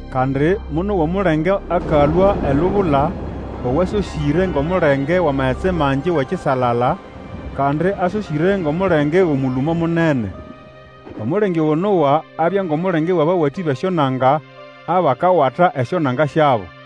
Kandi monowa omulenge akalũa elubula owasosĩre ngʼomulenge wʼamagetsi mangi wʼekisalala, kandi asosĩre ngʼomulenge wʼomũlũmo munene. Omulenge ogo nowa abya ngʼomulenge wʼabawatĩ bʼesyonanga abakawata esyonanga syabo.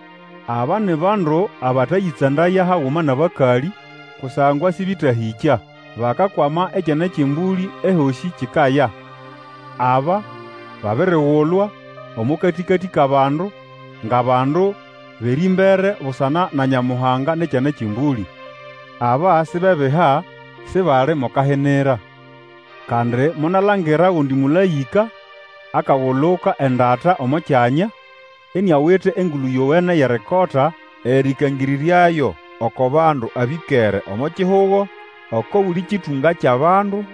Aba ni bandu abatayĩtsandaya haguma nʼabakalĩ, kusangwa sĩbetahĩkya. Bakakwama Ekyana kyʼEmbũlĩ ehosĩ kikaya. Aba babirigulwa omo katĩkatĩ kʼabandu ngʼabandu bʼerĩmbere busana na Nyamuhanga nʼEkyana kyʼEmbũlĩ. Aba sibebiha, sibali mo kahinira. Kandi monalangira ogundi mũlaĩka akaguluka endata omo kyanya, iniawite Engulu Yowene yʼerikota erĩkangĩrĩryayo oko bandu abĩkere omo kihugo, oko buli kĩtũnga kyʼabandu,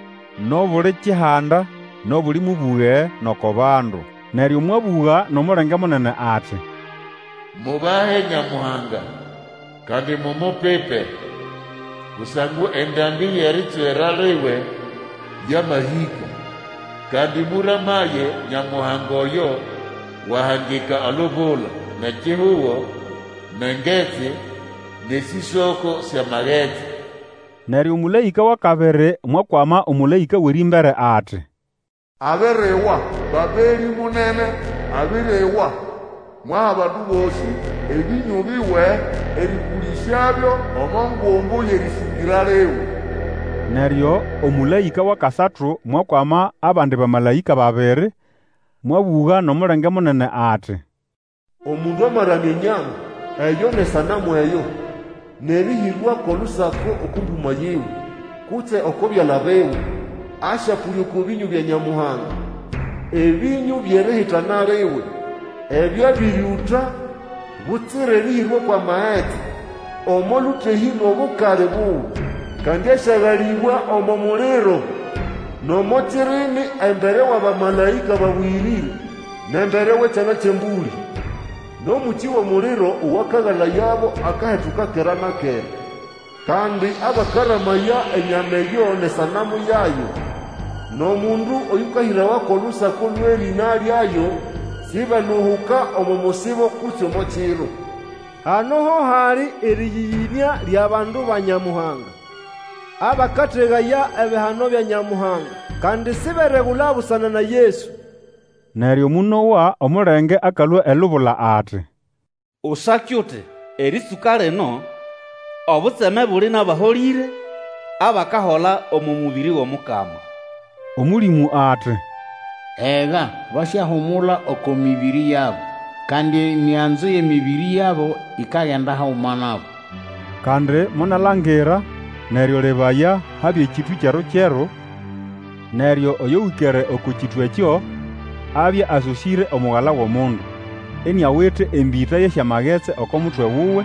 nʼobuli kihanda, nʼobuli mũbũge, nʼoko bandu. Neryo mwabũga nʼomulenge munene ati, Mubahe Nyamuhanga, kandi mumupipe! Kusangwa endambĩ yʼeritswera liwe yamahĩka. Kandi mũramaye Nyamuhanga oyo wahangika olubula, nʼekihugo, nʼengetsi nʼesĩsoko syʼamagetsi! Neryo omũlaĩka wʼakabiri mwakwama omũlaĩka wʼerĩmbere ati, Abiriwa! Babelĩ munene abiriwa! Mwaha abandu bosĩ ebĩnyũ biwe erĩpũlĩsyabyo omo ngumbu yʼerĩsĩngĩra liwe. Neryo omũlaĩka wʼakasatu mwakwama abandi bamalaĩka babiri, mwabũga nʼomulenge munene ati, Omundu amaramya enyama eyo nʼesanamu eyo, nʼerĩhĩrwa kʼolusako oko mbũmo yiwe, kutse oko byala biwe, asyapũlya oko bĩnyũ bya Nyamuhanga, ebĩnyũ byʼerihitana liwe ebyo abĩrĩũta butsira erĩhĩrwa kwʼamagetsi omo lũtehĩ lwʼobukali buwe! Kandi asyagalĩbwa omo muliro nʼomo kirimi embere wʼabamalaĩka babũyĩrĩre, nʼembere wʼEkyana kyʼEmbũlĩ. Nʼomũkĩ wʼomuliro owakagalayabo akahetuka kera na kera. Kandi abakaramaya enyama eyo nʼesanamu yayo, nʼomundu oyũkahĩrawa kwʼolusako lwʼerĩna lyayo, sibeluhuka omo musibo kutse omo kiro. Hano ho hali erĩyĩyĩnĩa lyʼabandu ba Nyamuhanga, abakategaya ebihano bya Nyamuhanga, kandi siberegula busana na Yesu. Neryo monowa omulenge akalũa elubula ati, Usake uti, Erĩtsũka lino, obutseme buli nʼabaholĩre, abakahola omo mũbĩrĩ wʼOmukama! Omũlĩmũ ati, Ega, basyahumula oko mĩbĩrĩ yabo, kandi emiganzo yʼemĩbĩrĩ yabo ikagenda haguma nabo. Kandi monalangira, neryo lebaya, habya ekĩtũ kyeru-kyeru, neryo oyo wĩkere oko kĩtũ ekyo, abya asosĩre omugala wʼomundu, iniawite embĩta yʼesyamagetsi oko mutwe wuwe,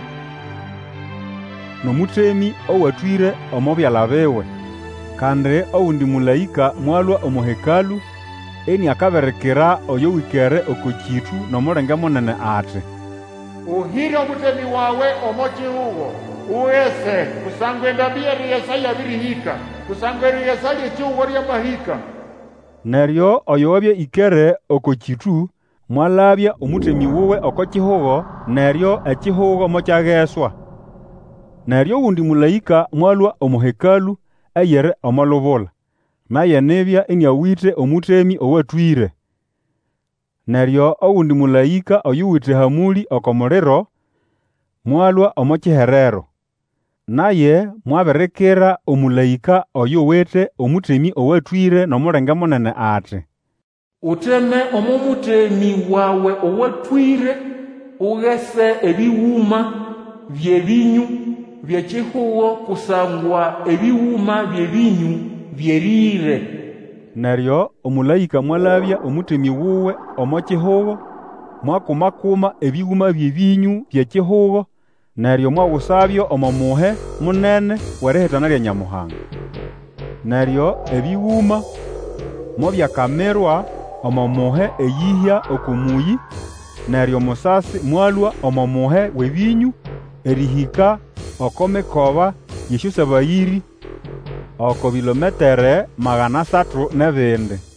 nʼomũtemĩ owatwĩre omo byala biwe. Kandi ogundi mũlaĩka mwalũa omo Hekalũ, iniakabirikira oyo wĩkere oko kĩtũ, nʼomulenge munene ati, Ũhĩre omũtemĩ wawe omo kihugo, ugese, kusangwa endambĩ yʼerigesa yabĩrĩhĩka, kusangwa erigesa lyʼekihugo lyamahĩka! Neryo oyo wabya ĩkere oko kĩtũ mwalabya omũtemĩ wuwe oko kihugo, neryo ekihugo mokyageswa. Neryo ogundi mũlaĩka mwalũa omo Hekalũ eyiri omo lubula, naye nibya iniawite omũtemĩ owatwĩre. Neryo ogundi mũlaĩka, oyuwite ehamũlĩ oko muliro, mwalũa omo kiherero. Naye mwabirikira omũlaĩka oyuwite omũtemĩ owatwĩre, nʼomulenge munene ati, Uteme omo mũtemĩ wawe owatwĩre, ugese ebĩgũma byʼebĩnyũ byʼekihugo, kusangwa ebĩgũma byʼebĩnyũ byerĩre. Neryo omũlaĩka mwalabya omũtemĩ wuwe omo kihugo, mwakuma-kuma ebĩgũma byʼebĩnyũ byʼekihugo, neryo mwagusabyo omo muhe munene wʼerihitana lya Nyamuhanga. Neryo ebĩgũma mobyakamirwa omo muhe eyĩhya oko mũyĩ, neryo musasi mwalũa omo muhe wʼebĩnyũ, erĩhĩka oko mikoba yʼesyosabayĩrĩ oko bilometere magana asatu nʼebindi.